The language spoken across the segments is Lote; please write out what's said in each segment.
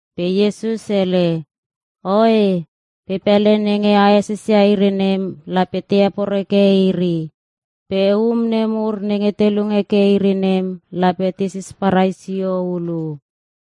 Pe Iesus hele, “Oe, pe pele nenge a esesia iri nem lape te heporeke iri. Pe um nemur nenge te lung heke iri nem lape te sisparai sio hulu.”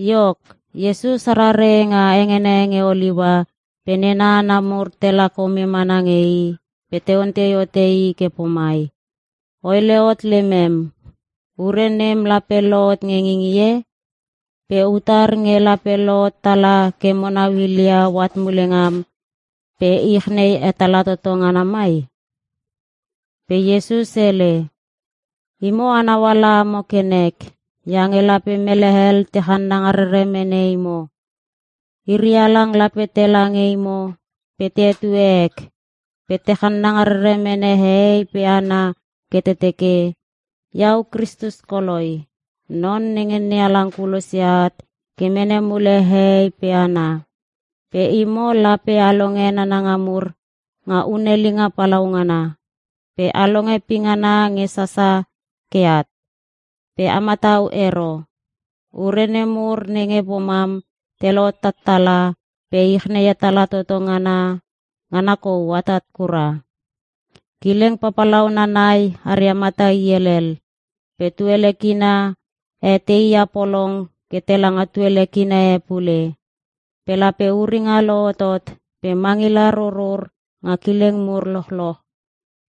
Iok, Iesus arare nga hengene nge Oliua pe nena hana mur tela kome mana nge I pe te ontei hote I ke pomai, “O hele hot lemem. Ure nem lape lohot nge ngingie? Pe utar nge lape lohot tala ke mo nau hilia oat mule ngam pe ich nei hetala toto ngana mai?” Pe Iesus hele, “Imo a nauala amo ke nek, iange lape mele hel te channanga rere mene imo. Iri halang lape tela nge imo pe te hetue ek, pe te channanga rere mene hehei pe hana ke te teke, ‘Iau Kristus koloi, Non nenge NeHalang kulosia at ke mene mule hehei pe hana.’ Pe imo lape a longe nananga mur nga hunelinga palaungana, pe a longe pingana nge sasa ke at. Pe a matau ero. Ure nemur nenge pomam te lohot tattala pe ich nei hetala toto ngana, ngana kou atat kura. Kileng papalauna nai aria mata i helel. Pe tuele kina e teia polong ke tela nga tuele kina e pule. Pe lape uringa lohotot pe mangila rurur nga kileng mur lochloch.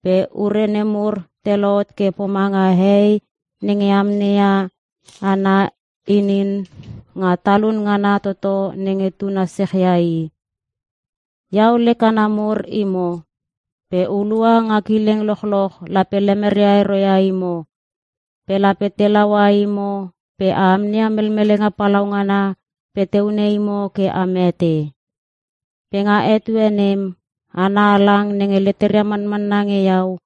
Pe ure nemur te lohot ke pomanga hei nenge amneia ana inin nga talun ngana toto nenge tuna sechia i. “Iau lek hana mur imo. Pe hulua nga kileng lochloch lape lemeria ero ia imo. Pe lape te laua imo pe a amneia melmelenga palaungana pe te hune imo ke a mete. Pe nga etue nem, hana halang nenge leteria manmanna nge Iau,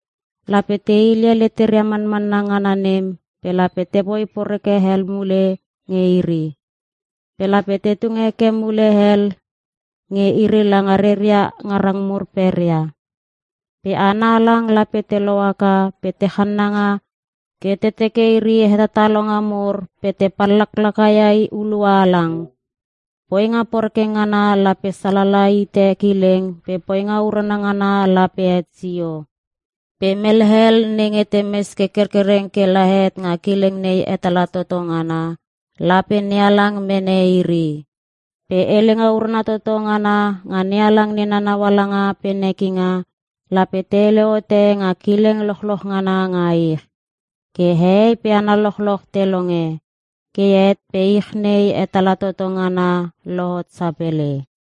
lape te hile leteria manmanna ngana nem pe lape te poi poreke hel mule nge iri. Pe lape te tung heke mule hel nge iri langa reria ngarang mur peria. Pe hana halang lape te lohaka pe te channanga ke te teke iri hetatalonga mur pe te pallaklaka ia hulua halang. Poinga poreke ngana lape salala hite kileng pe poinga urana ngana lape het sio. Pe mele hel nenge te mes ke kerkereng kela het nga kileng nei hetala toto ngana, lape NeHalang mene iri. Pe helenga urana toto ngana nga NeHalang nena naualanga pe nekinga, lape te hele hote nga kileng lochloch ngana nga ich, ke hehei pe hana lochloch te longe. Ke het pe ich nei hetala toto ngana lohot sapele.”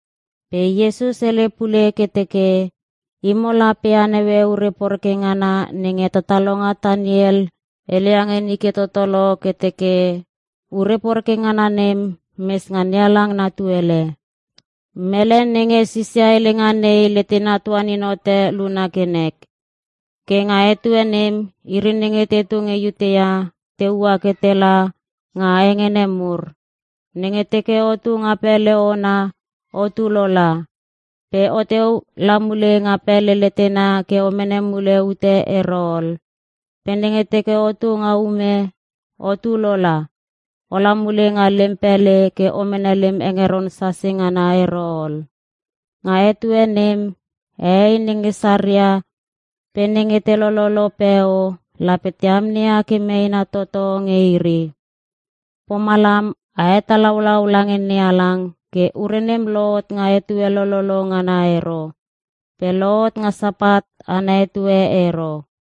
Pe Iesus hele pule ke teke, “Imo lape a naue ure poreke ngana nenge hetatalonga Taniel hele ia nge nike toto lo ke teke, ‘Ure poreke ngana nem mes nga NeHalang na tuele.’ Mele nenge sisia helenga nei letena tuanin hote luna ke nek. Ke nga etue nem, iri nenge tetu nge Iutea te ua ke tela nga hengene mur. Nenge teke otu nga pele ona, otu lola. Pe o teu la mule nga pele letena ke o mene mule ute ero ol. Pe nenge teke otu nga ume, otu lola. Ola mule nga lem pele ke o mene lem hengeron sase ngana ero ol. Nga etue nem, hehei nenge saria pe nenge te lololo peo lape te amneia ke meena toto nge iri. Pomalam a hetalaulau lange NeHalang ke ure nem lohot nga etue lololo ngana ero, pe lohot nga Sapat ana etue ero.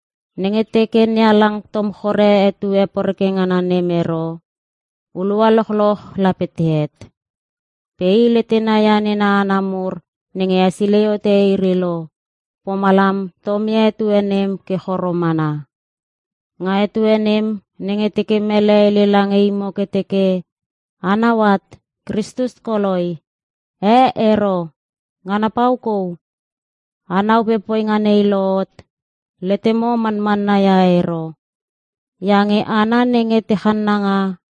Nenge teke NeHalang tom chore etue poreke ngana nem ero, hulua lochloch lape te het. Pe I letena ia nena hana mur nenge hesilei hote iri lo, pomalam tomia etue nem ke choro mana. Nga etue nem, nenge teke mele hele lange imo ke teke, ‘A nau at! Kristus koi! Eh, ero! Ngana pau kou!’ A nau pe poinga nei lohot, letemo manmanna ia ero. Iange hana nenge te channanga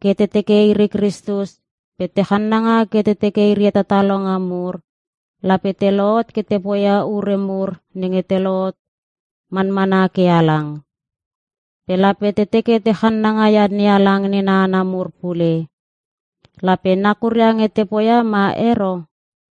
ke te teke iri Kristus pe te channanga ke te teke iri hetatalonga mur, lape te lohot ke te poia ure mur nenge te lohot manmana ke halang. Pe lape te teke te channanga ia NeHalang nena hana mur pule. Lape nakuria nge te poia ma ero.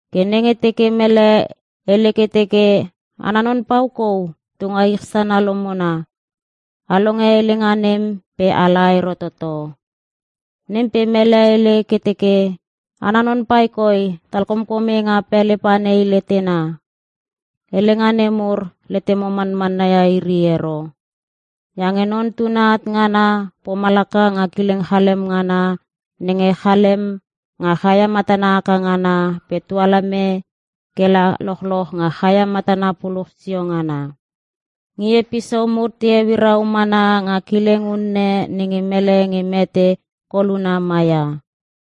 “Ke nenge teke mele hele ke teke, ‘Ana non pau kou tunga ich sana lomona,’ a longe helenga nem pe a la ero toto. Nem pe mele hele ke teke, ‘Ana non pai koi talkomkome nga pele pa nei letena.’ Helenga nemur, letemo manmanna ia iri ero. Iange Non Tuna at ngana, pomalaka nga kileng chalem ngana nenge chalem nga chaia matana haka ngana pe tualeme ke la lochloch nga chaia matana puluch sio ngana. Ngie pisou mur te euirau mana nga kileng unne nenge mele nge mete koluna maia.”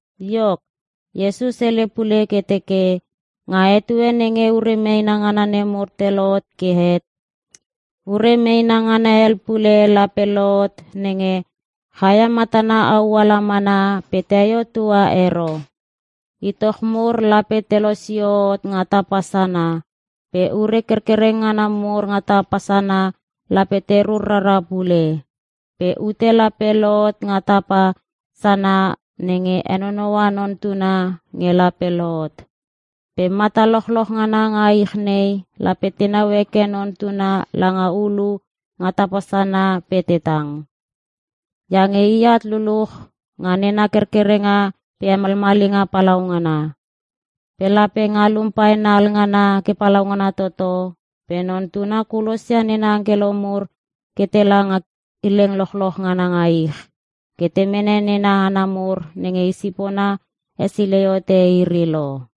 Iok, Iesus hele pule ke teke, “Nga etue nenge ure meena ngana nemur te lohot ke het, ure meena ngana hel pul lape lohot nenge: “‘Chaia matana au ala mana pe teio tua ero. Itoch mur lape te losio hot nga tapa sana, pe ure kerkereng ngana mur nga tapa sana lape te rur rara pule.’ “Pe ute lape lohot nga tapa sana nenge henonoua Non Tuna nge lape lohot. Pe mata lochloch ngana nga ich nei lape tenau heke Non Tuna langa ulu nga tapa sana pe te tang. Iange I at luluch nga nena kerkerenga pe hemalmalinga palaungana. Pe lape ngalum paena alngana ke palaungana toto pe Non Tuna kulosia nena angkelo mur ke tela nga kileng lochloch ngana nga ich, ke te mene nena hana mur nenge i sipona hesilei hote iri lo.”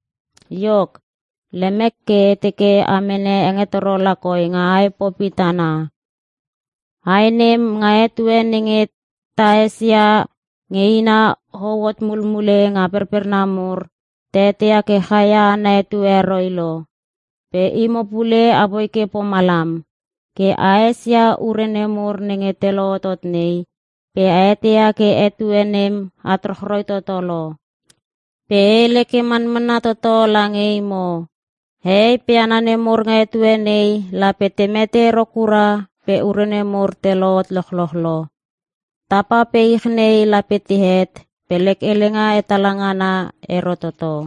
“Iok, lemek ke e teke a mene hengetoro lakoi nga ae popi tana. Ae nem, nga etue nenge ta esia nge ina hou hot mumule nga perperna mur, ta eteia ke chaia ana etue heroi lo. Pe imo pule apoi ke pomalam. Ke a esia ure nemur nenge te lohotot nei, pe a eteia ke etue nem at rochroi toto lo. Pe e hele ke manmanna toto lange imo. Hehei pe hana nemur nga etue nei lape te mete ero kura pe ure nemur te lohot lochloch lo. Tapa pe ich nei lape te het pe lek helenga hetala ngana ero toto.”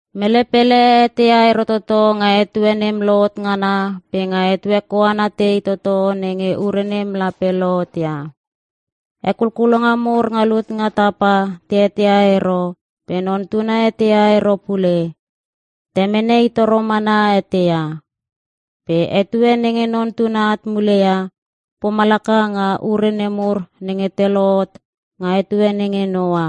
“Mele pele eteia ero toto, nga etue nem lohot ngana pe nga etue koana tei toto nenge ure nem lape lohotia. Hekulkulonga mur nga lut nga tapa te eteia ero pe Non Tuna eteia ero pule. Temene I toro mana eteia. Pe etue nenge Non Tuna at muleia, pomalaka nga ure nemur nenge te lohot nga etue nenge Noa.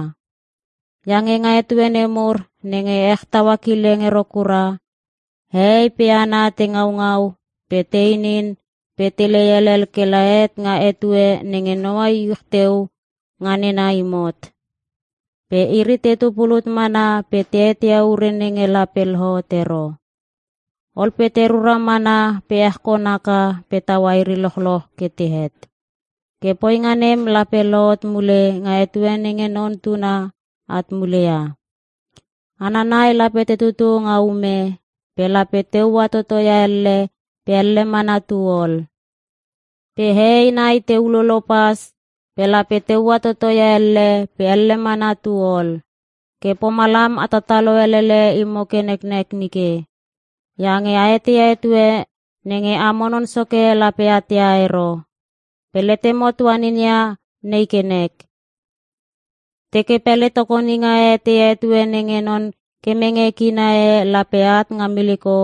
Iange nga etue nemur nenge ech taua kileng ero kura, hehei pe hana te ngaungau pe te inin pe te helei helel kela het nga etue nenge Noa iuch teu nga nena imot. Pe iri tetu pulut mana pe te eteia ure nenge lape lohot ero. Ol pe te rura mana pe ech kon haka pe taua iri lochloch ke te het. Ke poinga nem lape lohot mule nga etue nenge Non Tuna at mule ia. Hana nai lape te tutu nga ume, pe lape te ua toto ia elle pe elle mana tu ol. Pe hehei nai te ululo pas, pe lape te ua toto ia elle pe elle mana tu ol. “Ke pomalam a tatalo elele imo ke neknek nike. Iange a eteia etue nenge amo Non Soke lape at ia ero. Pe letemo tuanin ia nei ke nek; Teke pele tokoninga e eteia etue nenge non kemenga kina e lape at nga miliko,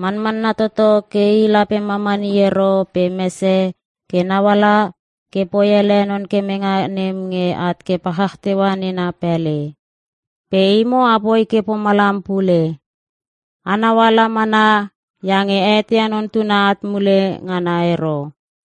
manmanna toto ke i lape mamani ero pe mese ke nauala ke poi ele non kemenga nem nge at ke palchach teua nena pele. Pe imo apoi ke pomalam pule. Anau ala mana iange a eteia Non Tuna at mule ngana ero.”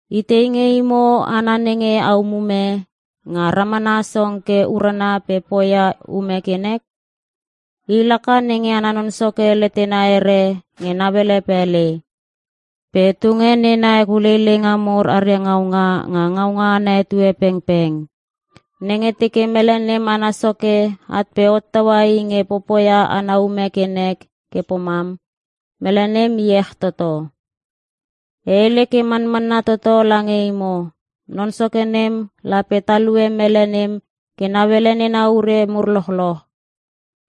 “Itei nge imo hana nenge a umume, nge ramana song ke urana pe poia ume ke nek? I laka nenge ana non soke letena here nge nauele pele, pe tunge nena hekuleileinga mur aria ngaunga nga ngaunga ana etue pengpeng. Nenge teke mele nem ana soke at pe hottaua i nge popoia ana ume ke nek ke pomam, mele nem iech toto. E hele ke manmanna toto lange imo, non soke nem lape talue mele nem ke nauele nena urelu mur lochloch.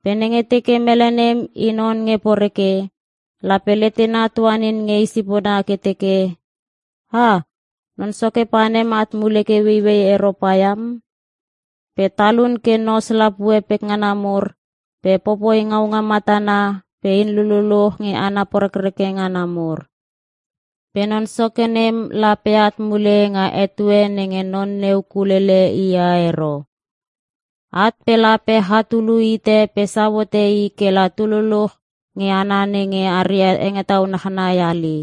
Pe nenge teke mele nem i non nge poreke, lape letena tuanin nge i sipona ke teke, ‘Ah! Non soke panem at mule ke ueiuei ero paiam.’ Pe talun ke nos lapue pekngana mur pe popoi ngaunga matana pe in lululuch nge hana porekreke ngana mur. Pe non soke nem lape at mule nga etue nenge non neu kulele i ia ero. At pe lape chatulu hite pe sau hote i kela tululuch nge hana nenge aria hengetau nachnai hali,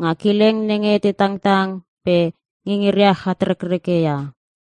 nga kileng nenge te tangtang pe ngingiria chatrekreke ia.”